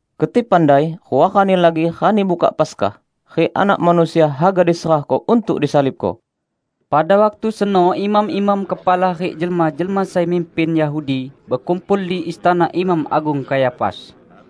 "Keti pandai rua rani lagi Rani Buka Paskah, rik Anak Manusia haga diserahko untuk disalibko!" Pada waktu seno imam-imam kepala rik jelma-jelma sai mimpin Yahudi bekumpul di istana Imam Agung Kayafas.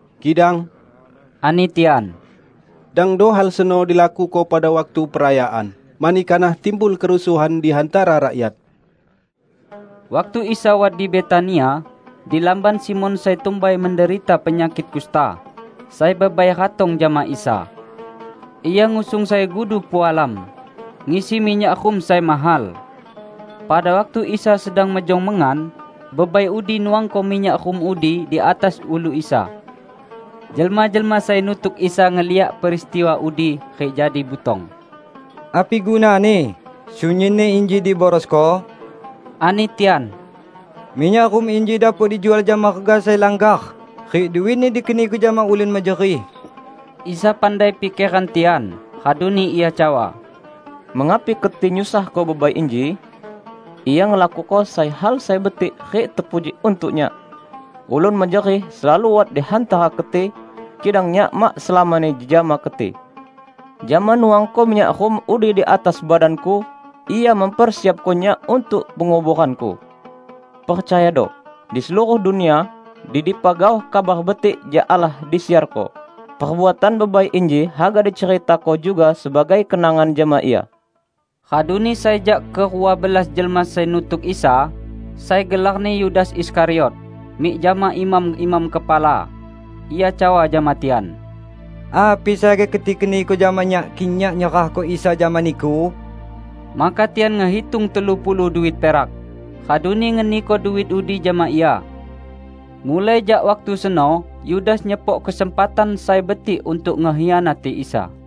"Kidang," ani tian, "dangdo hal seno dilakuko pada waktu perayaan, mani kanah timbul kerusuhan di hantara rakyat." Waktu Isa wat di Betania, di lamban Simon sai tumbai menderita penyakik kusta, sai bebai ratong jama Isa. Ia ngusung sai gudu pualam, ngisi minyak rum sai mahal. Pada waktu Isa sedang mejong mengan, bebai udi nuangko minyak rum udi di atas ulu Isa. Jelma-jelma sai nutuk Isa ngeliak peristiwa udi rik jadi butong. "Api gunani sunyinni inji diborosko?" ani tian. "Minyak rum inji dapok dijual jama rega sai langgar, rik duitni dikeniko jama ulun mejerih!" Isa pandai pikeran tian, raduni Ia cawa, "Mengapi keti nyusahko bebai inji? Ia ngelakuko sai hal sai betik rik tepuji untuk Nyak. Ulun mejerih selalu wat di hantara keti, kidang Nyak mak selamani jejama keti. Jama nuangko minyak rum udi di atas badan-Ku, ia mempersiapko Nyak untuk penguboran-Ku. Percayado! Di seluruh dunia, di dipa gaoh Kabar Betik jak Allah disiarko, perbuatan bebai inji haga diceritako juga sebagai kenangan jama ia." Raduni sai jak kerua belas jelma sai nutuk Isa, sai gelarni Yudas Iskariot, mik jama imam-imam kepala. Ia cawa jama tian, "Api sai haga keti keniko jama nyak kik nyak nyerahko Isa jama niku?" Maka tian ngehitung telu puluh duit perak, raduni ngeniko duit udi jama ia. Mulai jak waktu seno Yudas nyepok kesempatan sai betik untuk ngekhianati Isa.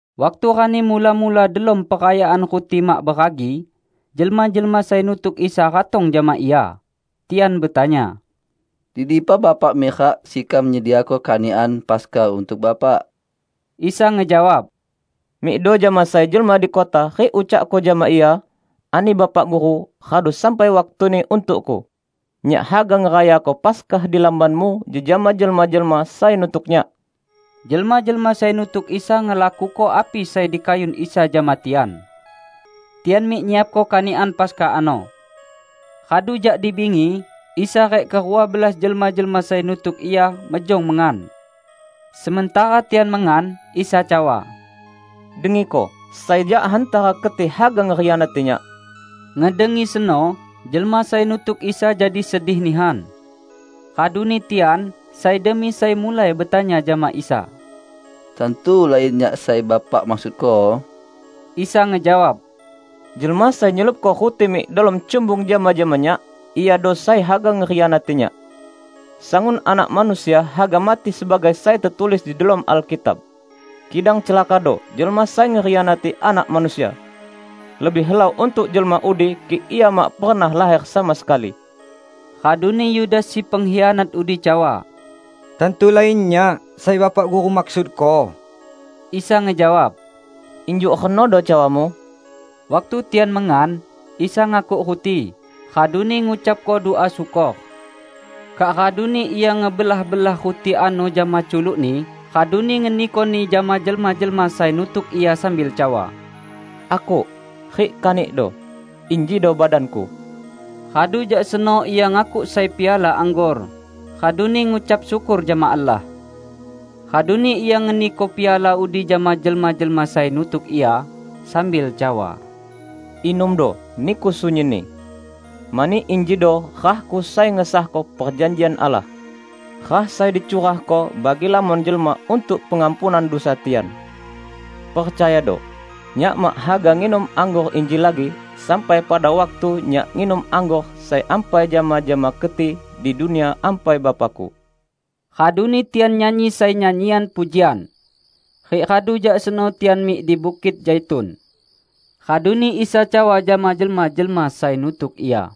Waktu rani mula-mula delom Perayaan Ruti Mak Beragi, jelma-jelma sai nutuk Isa ratong jama Ia. Tian betanya, "Di dipa Bapak mirak sekam nyediako kanikan Paskah untuk Bapak?" Isa ngejawab, "Mikdo jama sai jelma di kota rik ucakko jama ia, 'Ani Bapak Guru, radu sampai waktuni untuk-Ku; Nyak haga ngerayako Paskah di lambanmu jejama jelma-jelma sai nutuk Nyak.' " Jelma-jelma sai nutuk Isa ngelakuko api sai dikayun Isa jama tian. Tian mik nyiapko kanikan Paskah ano. Radu jak di bingi, Isa rik kerua belas jelma-jelma sai nutuk Ia mejong mengan. Sementara tian mengan, Isa cawa, "Dengiko: sai jak hantara keti haga ngekhianati Nyak." Ngedengi seno, jelma sai nutuk Isa jadi sedih nihan. Raduni tian, sai demi sai mulai betanya jama Isa, "Tantu lain nyak sai Bapak maksudko?" Isa ngejawab, "Jelma sai nyelupko ruti mik delom cumbung jama-jama Nyak, iado sai haga ngekhianati Nyak. Sangun Anak Manusia haga mati sebagai sai tetulis di delom Alkitab. Kidang celakado jelma sai ngekhianati Anak Manusia! Lebih helau untuk jelma udi kik ia mak pernah laher sama sekali!" Raduni Yudas si pengkhianat udi cawa, "Tantu lain nyak sai Bapak Guru maksudko?" Isa ngejawab, "Injuk renodo cawamu!" Waktu tian mengan, Isa ngakuk ruti, raduni ngucapko dua syukor. Kak raduni Ia ngebelah-belah ruti ano jama culuk-Ni raduni ngenikoni jama jelma-jelma sai nutuk Ia sambil cawa, "Akuk, rik kanikdo; injido badan-Ku." Radu jak seno Ia ngakuk sai piala anggor, raduni ngucap syukor jama Allah. Raduni Ia ngeniko piala udi jama jelma-jelma sai nutuk Ia, sambil cawa, "Inumdo, niku sunyinni. Mani injido rah-Ku sai ngesahko perjanjian Allah -- rah sai dicurahko bagi lamon jelma untuk pengampunan dusa tian. Percayado: Nyak mak haga nginum anggor inji lagi sampai pada waktu Nyak nginum anggor sai ampai jama-jama keti di Dunia Ampai Bapa-Ku." Raduni tian nyanyi sai nyanyian pujian. Rik radu jak seno tian mik di Bukit Zaitun. Raduni Isa cawa jama jelma-jelma sai nutuk Ia,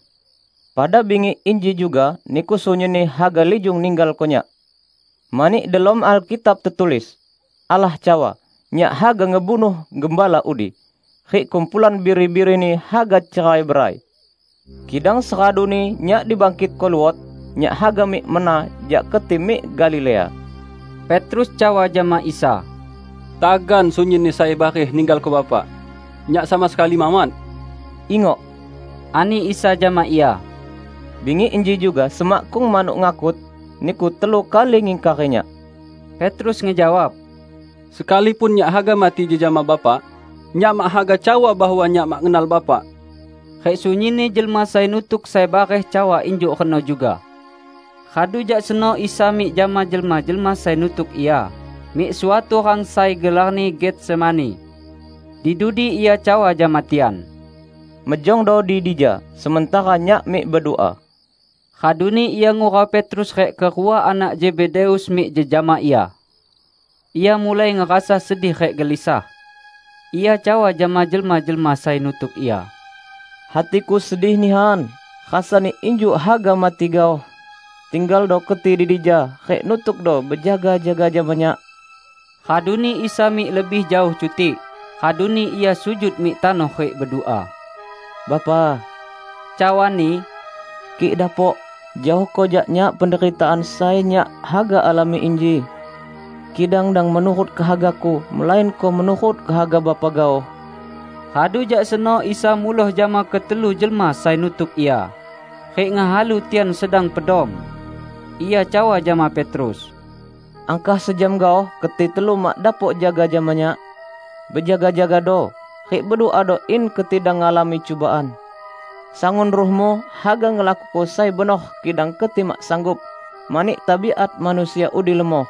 "Pada bingi inji juga niku sunyinni haga lijung ninggalko Nyak; mani delom Alkitab tetulis: Allah cawa, 'Nyak haga ngebunuh gembala udi, rik kumpulan biri-birini haga cerai-berai.' Kidang seraduni Nyak dibangkitko luot, Nyak haga mik mena jak keti mik Galilea." Petrus cawa jama Isa, "Tagan sunyinni sai bareh ninggalko Bapak, nyak sama sekali mawat!" "Ingok," ani Isa jama ia, "Bingi inji juga, semakkung manuk ngakut, niku telu kali ngingkari Nyak." Petrus ngejawab, "Sekalipun nyak haga mati jejama Bapak, nyak mak haga cawa bahwa nyak mak ngenal Bapak." Rik sunyinni jelma sai nutuk sai bareh cawa injuk reno juga. Radu jak seno Isa mik jama jelma-jelma sai nutuk Ia mik suatu rang sai gelarni Getsemani. Di dudi Ia cawa jama tian, "Mejongdo di dija sementara Nyak mik bedua." Raduni Ia ngurau Petrus rik kerua anak Zebedeus mik jejama Ia. Ia mulai ngerasa sedih rik gelisah. Ia cawa jama jelma-jelma sai nutuk Ia, "Hati-Ku sedih nihan, rasani injuk haga mati gaoh. Tinggaldo keti di dija, rik nutukdo bejaga-jaga jama Nyak." Raduni Isa mik lebih jaoh cutik, raduni Ia sujud mik tanoh rik bedua. "Bapa," cawa-Ni, "kik dapok, jaohko jak Nyak penderitaan sai Nyak haga alami inji. Kidang dang menurut kehaga-Ku, melainko menurut kehaga Bapa gaoh." Radu jak seno Isa muloh jama ketelu jelma sai nutuk Ia rik ngehalu tian sedang pedom. Ia cawa jama Petrus, "Angkah sejam gaoh keti telu mak dapok jaga jama Nyak? Bejaga-jagado, rik beduado in keti dang ngalami cubaan. Sangun ruhmu haga ngelakuko sai benor kidang keti mak sanggup, mani tabiat manusia udi lemoh."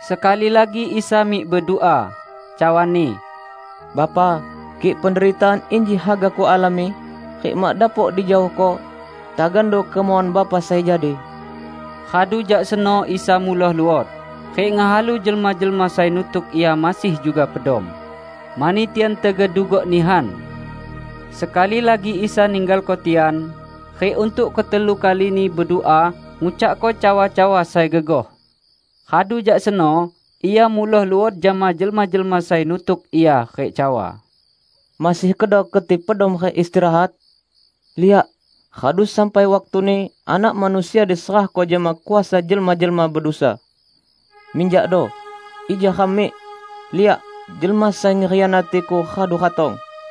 Sekali lagi Isa mik bedua, cawa-Ni, "Bapa, kik penderitaan inji haga Kualami, rik mak dapok dijaohko, tagando kemauan Bapa sai jadi." Radu jak seno Isa muloh luot, rik ngehalu jelma-jelma sai nutuk Ia masih juga pedom, mani tian tegedugok nihan. Sekali lagi Isa ninggalko tian rik untuk ketelu kalini bedua ngucakko cawa-cawa sai gegoh. Radu jak seno Ia muloh luot jama jelma-jelma sai nutuk Ia rik cawa, "Masih kedo keti pedom rik istirahat? Liak, radu sampai waktuni Anak Manusia diserahko jama kuasa jelma-jelma bedusa. Minjakdo, ija ram mik. Liak! Jelma sai ngekhianati-Ku radu ratong!"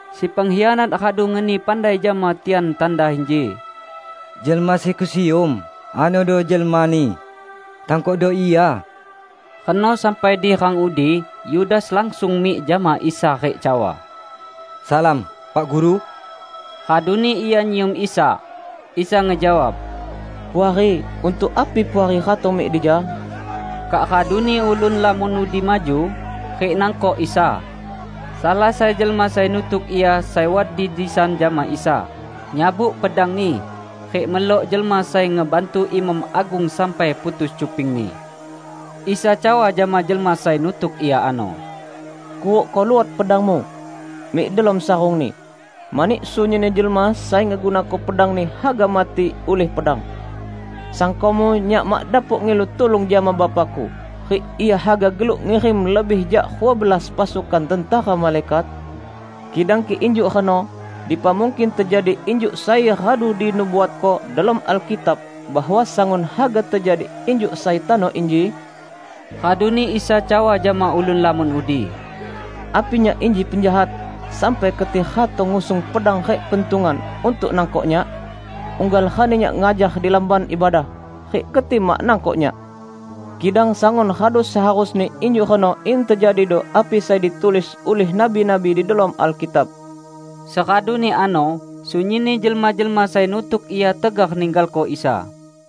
Si pengkhianat radu ngeni pandai jama tian tanda inji, "Jelma sai kusium, anodo jelmani. Tangkokdo Ia!" Reno sampai di rang udi, Yudas langsung mik jama Isa rik cawa, "Salam, Pak Guru!" Raduni ia nyium Isa. Isa ngejawab, "Puari, untuk api Puari ratong mik dija?" Kak raduni ulun lamon udi maju, rik nangkok Isa. Salah sai jelma sai nutuk Ia sai wat di disan jama Isa, nyabut pedangni rik melok jelma sai ngebantu imam agung sampai putus cupingni. Isa cawa jama jelma sai nutuk Ia ano, "Kurukko luot pedangmu mik delom sarungni, mani sunyinni jelma sai ngegunako pedangni haga mati ulih pedang. Sangkomu Nyak mak dapok ngilu tulung jama Bapa-Ku, rik Ia haga geluk ngirim lebih jak rua belas pasukan tentera malaikat? Kidang kik injuk reno, dipa mungkin tejadi injuk sai radu dinubuatko delom Alkitab bahwa sangun haga tejadi injuk sai tano inji?" Raduni Isa cawa jama ulun lamon udi, "Api Nyak inji penjahat, sampai keti ratong ngusung pedang rik pentungan untuk nangkok Nyak? Unggal rani Nyak ngajar di Lamban Ibadah, rik keti mak nangkok Nyak! Kidang sangun radu seharusni injuk reno in tejadido api sai ditulis ulih nabi-nabi di delom Alkitab." Seraduni ano, sunyinni jelma-jelma sai nutuk Ia tegar ninggalko Isa.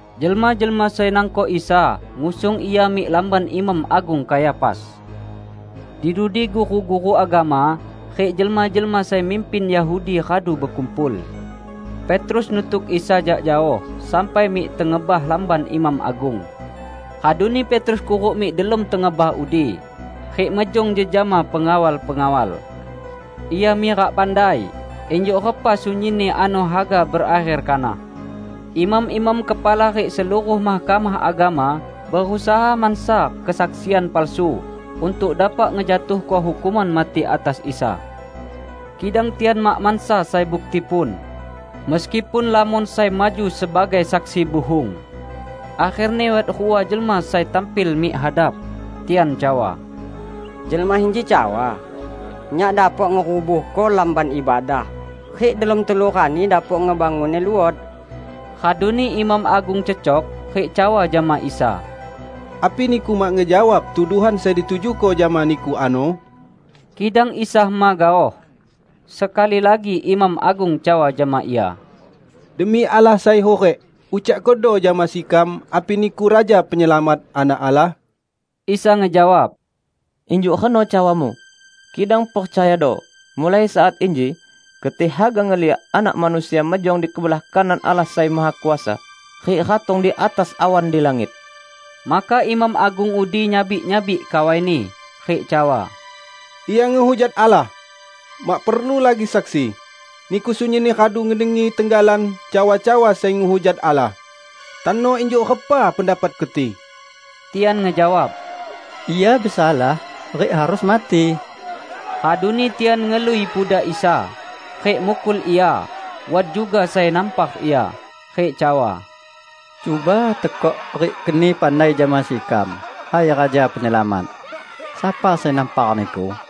Jelma-jelma sai nangkok Isa ngusung Ia mik lamban Imam Agung Kayafas. Di dudi guru-guru agama rik jelma-jelma sai mimpin Yahudi radu bekumpul. Petrus nutuk Isa jak jaoh sampai mik tengebah lamban imam agung. Raduni Petrus kuruk mik delom tengebah udi, rik mejong jejama pengawal-pengawal. Ia mirak pandai injuk repa sunyinni ano haga berakher kanah. Imam-imam kepala rik seluruh Mahkamah Agama berusaha mansa kesaksian palsu untuk dapok ngejatuhko hukuman mati atas Isa. Kidang tian mak mansa sai buktipun, meskipun lamon sai maju sebagai saksi buhung. Akherni wat rua jelma sai tampil mik hadap. Tian cawa, "Jelma inji cawa, 'Nyak dapok ngerubuhko Lamban Ibadah, rik delom telu rani dapok ngebangunni luot.' " Raduni imam agung cecok, rik cawa jama Isa, "Api Niku mak ngejawab tuduhan sai ditujuko jama Niku ano?" Kidang Isa hema gaoh. Sekali lagi imam agung cawa jama Ia, "Demi Allah sai hurik, ucakkodo jama sekam api Niku Raja Penyelamat, Anak Allah?" Isa ngejawab, "Injuk reno cawamu. Kidang percayado: mulai saat inji, keti haga ngeliak Anak Manusia mejong di kebelah kanan Allah Sai Mahakuasa, rik ratong di atas awan di langit!" Maka imam agung udi nyabik-nyabik kawaini, rik cawa, "Ia ngehujat Allah! Mak perlu lagi saksi. Niku sunyinni radu ngedengi tenggalan cawa-cawa sai ngehujat Allah. Tano injuk repa pendapat keti?" Tian ngejawab, "Ia besalah, rik harus mati." Raduni tian ngelui pudak Isa, rik mukul Ia. Wat juga sai nampar Ia rik cawa, "Cuba tekok rik keni pandai jama sekam, hai Raja Penyelamat! Sapa sai nampar Niku?"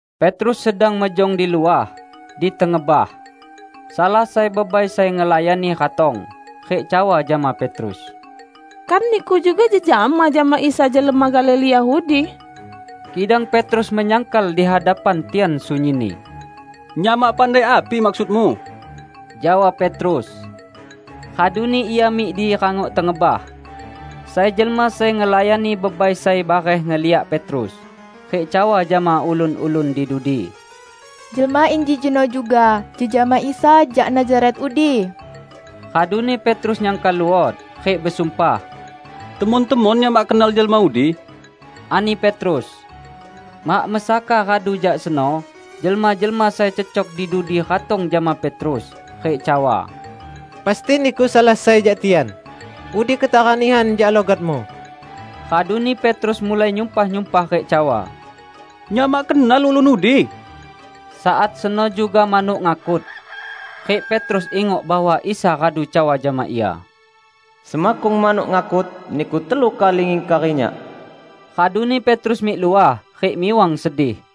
Petrus sedang mejong di luah, di tengebah. Salah sai bebai sai ngelayani ratong, rik cawa jama Petrus, "Kan niku juga jejama jama Isa jelma Galilea udi?" Kidang Petrus menyangkal di hadapan tian sunyinni. "Nyak mak pandai api maksudmu," jawab Petrus, raduni ia mik di rangok tengebah. Sai jelma sai ngelayani bebai sai bareh ngeliak Petrus, rik cawa jama ulun-ulun di dudi, "Jelma inji jeno juga jejama Isa jak Nazaret udi." Raduni Petrus nyangkal luot, rik besumpah, "Temon-temon nyak mak kenal jelma udi!" ani Petrus. Mak mesaka radu jak seno, jelma-jelma sai cecok di dudi ratong jama Petrus, rik cawa, "Pasti niku salah sai jak tian. Udi ketara nihan jak logatmu." Raduni Petrus mulai nyumpah-nyumpah rik cawa, "Nyak mak kenal ulun udi!" Saat seno juga manuk ngakut. Rik Petrus ingok bahwa Isa radu cawa jama ia, "Semakkung manuk ngakut, niku telu kali ngingkari Nyak." Raduni Petrus mik luah, rik miwang sedih.